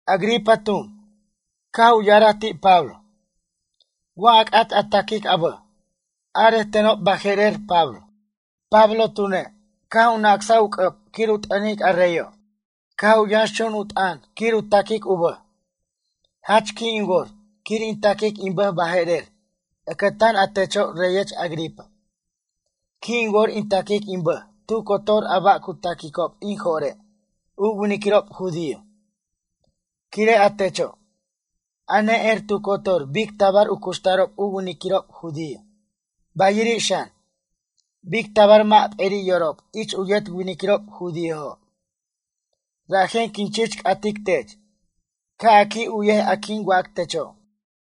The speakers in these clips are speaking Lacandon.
Agripa tun, caj u ya'araj ti' Pablo: ―Wa a c'at a taquic a bʌj, arej tenob baje'rer Pablo. Pablo tune', caj u nacsaj u c'ʌb quir u t'ʌnic a reyo'. Caj u yʌnx chun u t'ʌn quir u taquic u bʌj: ―Jach qui' in wor quir in taquic in bʌj baje'rer ʌcʌtan a techo' reyech Agripa. Qui' in wor in taquic in bʌj tu cotor ba' a cu taquicob in jo're' u winiquirob judío. Quire' a techo', a ne'er tu cotor bic tabar u cuxtarob u winiquirob judío bayiri' xan, bic tabar mʌ' p'eri' yorob ich u yet winiquirob judíojo'. Rajen quin chich c'atic tech, ca' a qui' u'yej a quin wac techo'.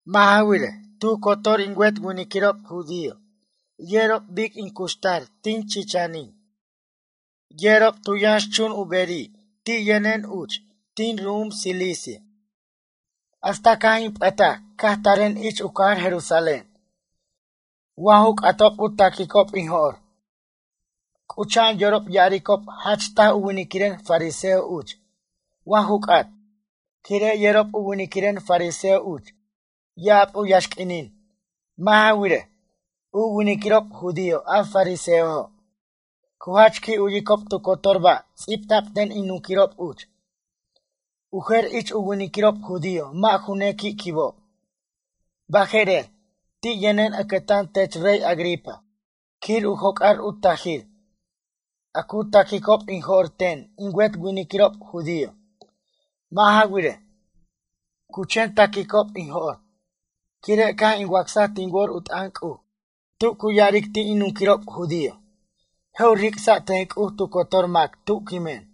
Mʌ' ja wirej, tu cotor in wet winiquirob judío yerob bic in cuxtar tin chichinin. Yerob tu yʌnxchun u beri' ti' yʌnen uch, tin ru'um Cilicia, hasta caj in p'ʌtaje' caj taren ich u cajar Jerusalén. Wa ju c'atob a cu taquicob in jo'r, c'ucha'an yorob ya'aricob jach taj u winiquiren fariseo uch wa ju c'at, quire' yerob u winiquiren fariseo uch ya'ab u yaxq'uinin. Mʌ' ja wirej, u winiquirob judío a fariseojo' cu jach qui' u'yicob tu cotor ba' ts'ibta'b ten in nunquirob uch. U jer ich u winiquirob judío mʌ' ju nequi' quibob. Baje'rer, ti' yʌnen ʌcʌtan tech rey Agripa quir u joc'ar u tajir a cu taquicob in jo'r ten in wet winiquirob judío. Mʌ' ja wirej, cu chen taquicob in jo'r, quire' caj in wacsaj tin wor u t'ʌn C'uj tu cu ya'aric ti' in nunquirob judío, je' u ric'sa' ten C'uj tu cotor mac tu quimen.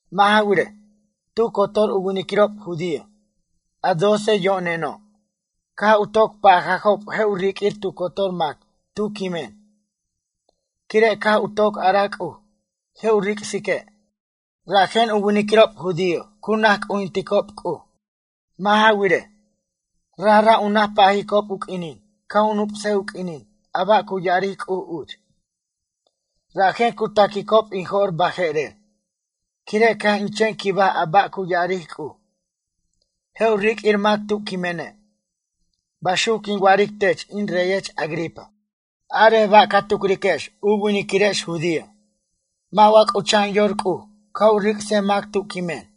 Mʌ' ja wirej, tu cotor u winiquirob judío, a doce yo'neno', caj u toc pajajob je' u riq'uir tu cotor mac tu quimen, quire' caj u toc araj C'uj je' u ric'sique' rajen u winiquirob judío cu naj c'ujinticob C'uj. Mʌ' ja wirej, Rajra' u naj pajicob u q'uinin ca' u nup'sej u q'uinin a ba' cu ya'aric C'uj uch. Rajen cu taquicob in jo'r baje'rer, quire' caj in chen quibaj a ba' cu ya'aric C'uj: “Je' u riq'uir mac tu quimene'.” Baxuc quin wa'aric tech in reyech Agripa. Arej ba' ca tucriquex u winiquirex judío. Mʌ' wa c'ucha'an yor C'uj ca' u ric'sej mac tu quimen?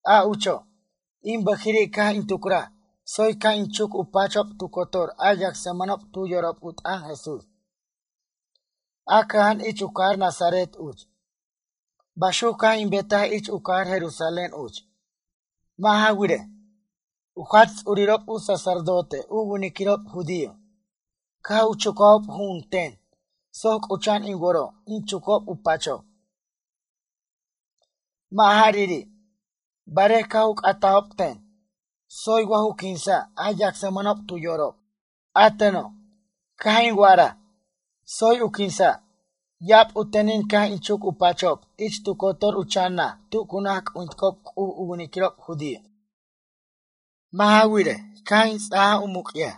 A ucho', in bʌjiri' caj in tucraj tsoy ca' in chuc u pachob tu cotor a yacsmʌnob tu yorob u t'ʌn Jesús, a cʌja'an ich u cajar Nazaret uch. Baxuc caj in betaj ich u cajar Jerusalén uch. Mʌ' ja wirej, u jach ts'urirob u sacerdote u winiquirob judío, caj u chucajob ju'un ten soc c'ucha'an in woro' in chucob u pachob. Mʌ' jariri', barej caj u c'atajob ten: “Tsoy wa ju quinsa' a yacsmʌnob tu yorob?” A teno', caj in wa'araj: “Tsoy u quinsa'.” Ya'ab u tenin caj in chuc u pachob ich tu cotor u chan naj tu cu naj c'ujinticob C'uj u winiquirob judío. Mʌ' ja wirej, caj in ts'aj u muc'yaj,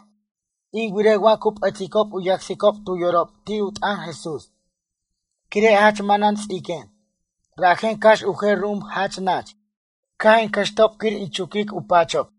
in wirej wa cu p'ʌticob u yacsicob tu yorob ti' u t'ʌn Jesús. Quire' jach manan ts'iquen, rajen cax u jer ru'um jach nach, caj in cʌxtob quir in chuquic u pachob.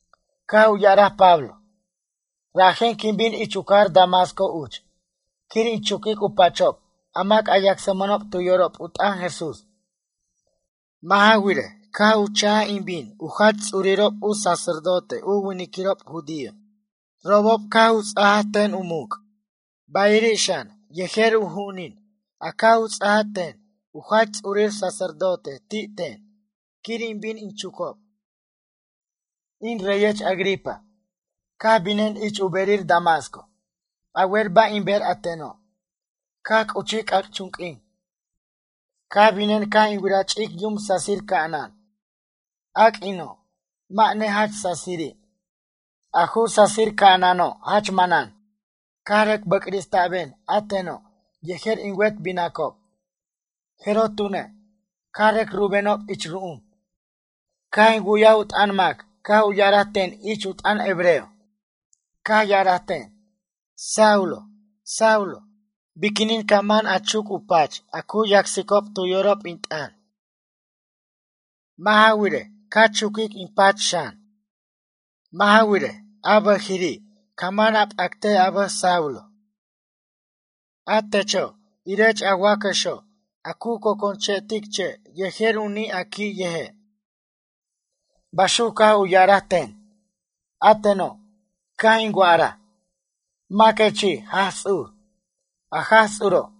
Caj u ya'araj Pablo: ―Rajen quin bin ich u cajar Damasco uch quir in chuquic u pachob a mac a yacsmʌnob tu yorob u t'ʌn Jesús. Mʌ' ja wirej, caj u cha'j in bin u jach ts'urirob u sacerdote u winiquirob judío, robob caj u ts'aj ten u muc', bayiri' xan, yejer u ju'unin a caj u ts'a ten u jach ts'urir sacerdote ti' ten quir in bin in chucob. In reyech Agripa, caj binen ich u berir Damasco. A wer ba' in ber a teno'? Caj c'uchij c'ac'chunq'uin, caj binen caj in wiraj ch'ic yum sasir ca'anan. A q'uino', mʌ' nejach sasiri', a ju sasir ca'anano' jach manan. Caj rʌc bʌc'rista'ben a teno' yejer in wet binacob. Jeroj tune', caj rʌc rubenob ich ru'um, caj in wu'yaj u t'ʌn mac caj u ya'araj ten ich u t'ʌn hebreo. Caj ya'araj ten: “Saulo, Saulo, biquinin ca man a chuc u pach a yacsicob tu yorob in t'ʌn? Mʌ' ja wirej, ca chuquic in pach xan? Mʌ' ja wirej, a bʌjiri' ca man a p'act a bʌj Saulo. A techo', irech a wacʌxo' a cu conconche'tic u che' yejer u ni' a qui' yeje'.” Baxuc caj u ya'araj ten. ’A teno', caj in wa'araj: “Maquechi' Jaj Ts'ur?” A Jaj Ts'uro',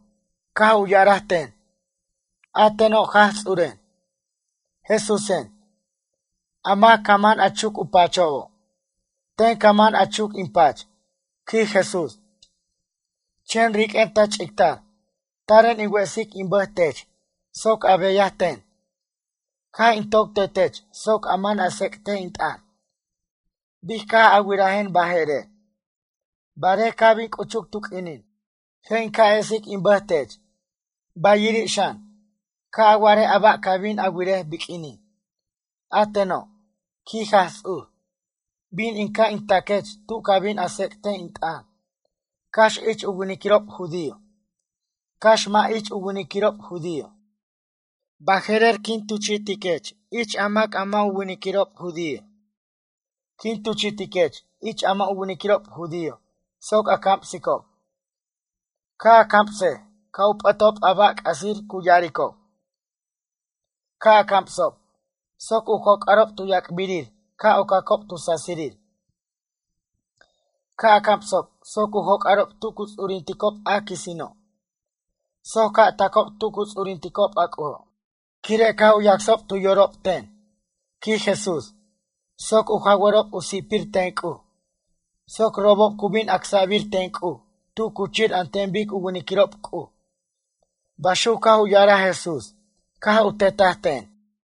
caj u ya'araj ten: “A teno' Jaj Ts'uren, Jesúsen, a mac ca man a chuc u pachobo', ten ca man a chuc in pach, quij Jesús. in pach. Chen riq'uen ta ch'ictar. Taren in wesic in bʌj tech soc a beyaj ten. Caj in toc tetech soc a man a tsec'tej in t'ʌn, bic caj a wirajen baje'rer. Barej ca' bin c'uchuc tu q'uinin, je' in ca' esic in bʌj tech. Bayriri' xan, ca' a wa'arej a ba' ca' bin a wirej biq'uinin. A teno', quij Jaj Ts'ur, bin in ca' in taquech tu ca bin a tsec't in t'ʌn, cax ich u winiquirob judío, cax mʌ' ich u winiquirob judío. Baje'rer, quin tuchi'tiquech ich a mac a mʌ' u winiquirob judío. Quin tuchi'tiquech ich a mʌ' u winiquirob judío soc a camsicob. Ca' a camsej ca' u p'ʌtob a ba' c'asir cu ya'aricob. Ca' a camsob, soc u joc'arob tu yac'birir ca' ocacob tu sasirir. Ca' a camsob soc u joc'arob tu cu ts'urinticob a quisino', soc ca' tacob tu cu ts'urinticob a C'ujo', quire' caj u yacsob tu yorob ten, quij Jesús. Soc u jawʌrob u si'pir ten C'uj, soc robob cu bin acsa'bir ten C'uj tu cuchir an ten bic u winiquirob C'uj.” Baxuc caj u ya'araj Jesús caj u tetaj ten.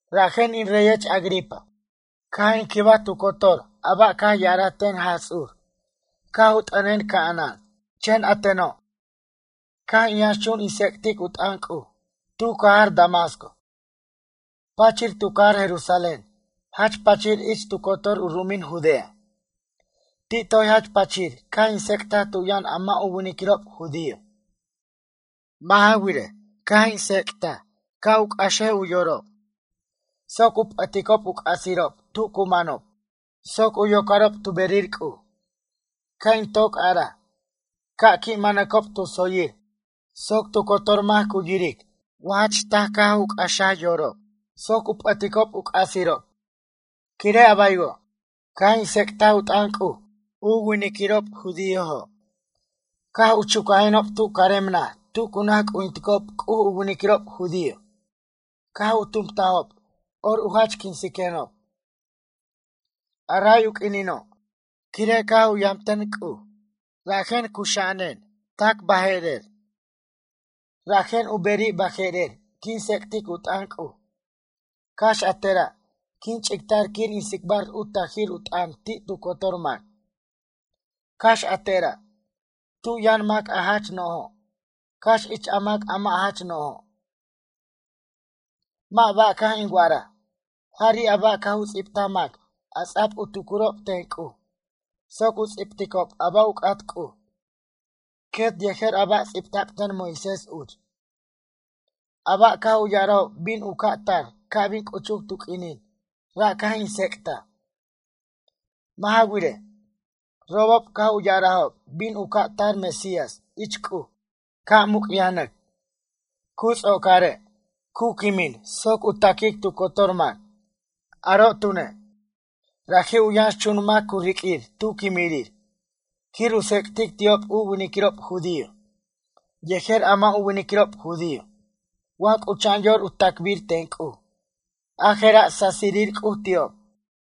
Rajen in reyech Agripa, caj in quibaj tu cotor a ba' caj ya'araj ten Jaj Ts'ur caj u t'ʌnen ca'anan. Chen a teno', caj in yʌnxchun in tsec'tic u t'ʌn C'uj tu cajar Damasco, pachir tu cajar Jerusalén jach pachir ich tu cotor tu ru'umin Judea. Ti' toy jach pachir caj in tsec'taj tu yʌn a mʌ' u winiquirob judío. Mʌ' ja wirej, caj in tsec'taj ca' u c'axej u yorob, soc u p'ʌticob u c'asirob tu cu manob soc u yocarob tu berir C'uj. Caj in toc araj, ca' qui' manacob tu tsoyir soc tu cotor mac cu yiric wa jach taj ca' c'axaj yorob, soc u p'ʌticob u c'asirob. Quire' a baywo', caj in tsec'taj u t'ʌn C'uj a winiquirob judiójo', caj u chucajenob tu carem naj tu cu naj c'ujinticob C'uj u winiquirob judío. Caj u tumtajob or u jach quinsenob, a ray u q'uinino'. Quire' caj u yamten C'uj, rajen cuxa'anen tac baje'rer. Rajen u beri' baje'rer quin tsec'tic u t'ʌn C'uj, cax a tera' quin ch'ictar quir in tsicbar u tajir t'ʌn ti' tu cotor mac. Cax a tera', tu yʌn mac a jach no'jo', cax ich a mac' a mʌ' jach no'jo'. Mʌ' ba' caj in wa'araj, jari' a ba' caj u ts'ibtaj mac a ts'a'b u tucurob ten C'uj soc u ts'ibticob a ba' u c'at C'uj, quet yejer a ba' ts'ibta'b ten Moisés uch. A ba' caj u ya'arajob bin u ca' tar ca' bin c'uchuc tu q'uinin ra' caj in tsec'taj. Mʌ' ja wirej, robob caj u ya'arajob bin u ca' tar Mesías ich C'uj ca' muc'yajnʌc, cu ts'ocare', cu quimin soc u taquic tu cotor mac. Aro' tune', raji' u yʌnxchun mac u ri'quir tu quimirir quir u tsec'tic ti'ob u winiquirob judío, yejer a mʌ' u winiquirob judío wa c'ucha'an yor u tacbir ten C'uj a jera' sasirir C'uj ti'ob.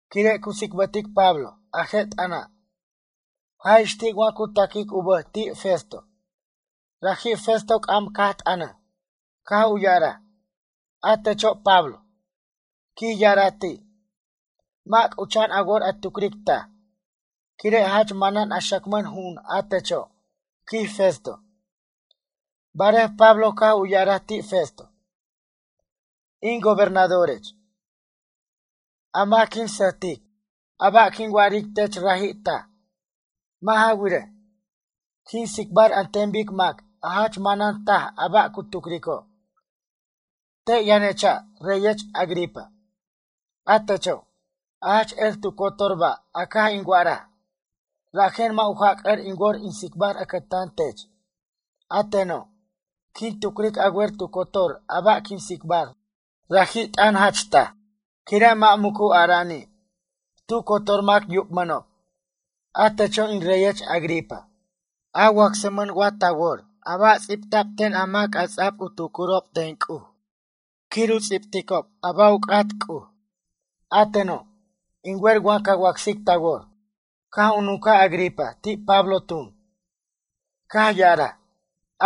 Quire' cu tsicbʌtic Pablo a je' t'ʌna', jaj ix ti' wa cu taquic u bʌj ti' Festo. Raji' Festo c'am caj t'ʌnʌj, caj u ya'araj: ―A techo' Pablo ―quij ya'araj ti'―, mʌ' c'ucha'an a wor a tucric taj, quire' jach manan a xacmʌn ju'un a techo' ―quij Festo. Barej Pablo caj u ya'araj ti' Festo: ―In gobernadorech, a mac quin sʌjtic, a ba' quin wa'aric tech raji' taj. Mʌ' ja wirej, quin tsicbar an ten bic mac a jach manan taj a ba' cu tucrico'. Te' yʌnecha' reyech Agripa, a techo', a jach er tu cotor ba' a caj in wa'araj, rajen mʌ' u jac'ʌr in wor in tsicbar ʌcʌtan tech. A teno', quin tucric a wer tu cotor a ba' quin tsicbar raji' t'ʌn jach taj, quire' mʌ' mucu ara'ani', tu cotor mac yubmʌnob. A techo' in reyech Agripa, a wacsmʌn wa ta wor a ba' ts'ibta'b ten a mac a ts'a'b u tucurob ten C'uj quir u ts'ibticob a ba' u c'at C'uj? A teno', in wer ca wacsic ta wor. Caj u nuncaj Agripa ti' Pablo tun, caj ya'araj: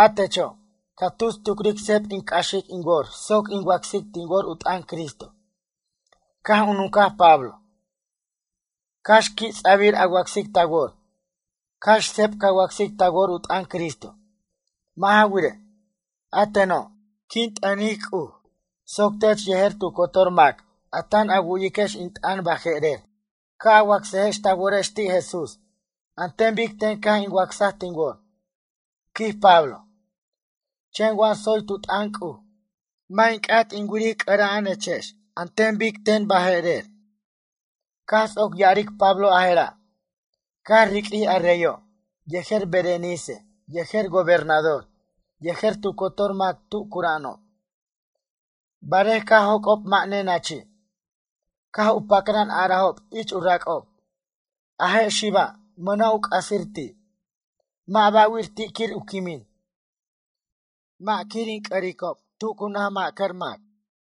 ―A techo', ca tus tucric seb in c'axic in wor soc in wacsic tin wor u t'ʌn Cristo. Caj u nuncaj Pablo: ―Cax qui' ts'abir a wacsic ta wor, cax seb ca wacsic ta wor u t'ʌn Cristo. Mʌ' ja wirej, a teno', in t'ʌnic C'uj soc tech yejer tu cotor mac a tan a wu'iquex in t'ʌn baje'rer ca' a wacsaquex ta worex ti' Jesús an ten bic ten caj in wacsaj tin wor ―quij Pablo―. Chen wa tsoy tu t'ʌn C'uj mʌ' in c'at in wiric c'ʌra'anechex an ten bic ten baje'rer. Caj ts'oc ya'aric Pablo a jera', caj riq'uij a reyo' yejer a Berenice yejer gobernador yejer tu cotor mac tu cura'anob. Barej caj joc'ob mʌ' nenachi', caj u pacran a'arajob ich u rac'ob: ―A je' xiba', mʌna' u c'asir ti'. Mʌ' ba'wir ti' quir u quimin, mʌ' quir in c'ʌricob tu cu naj ma'cʌr mac.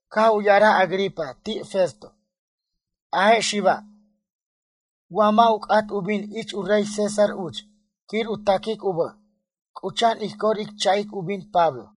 Caj u ya'araj Agripa ti' Festo: ―A je' xiba' wa mʌ' u c'at u bin ich u rey César uch quir u taquic u bʌj, c'ucha'an ij cor ij cha'ic u bin Pablo.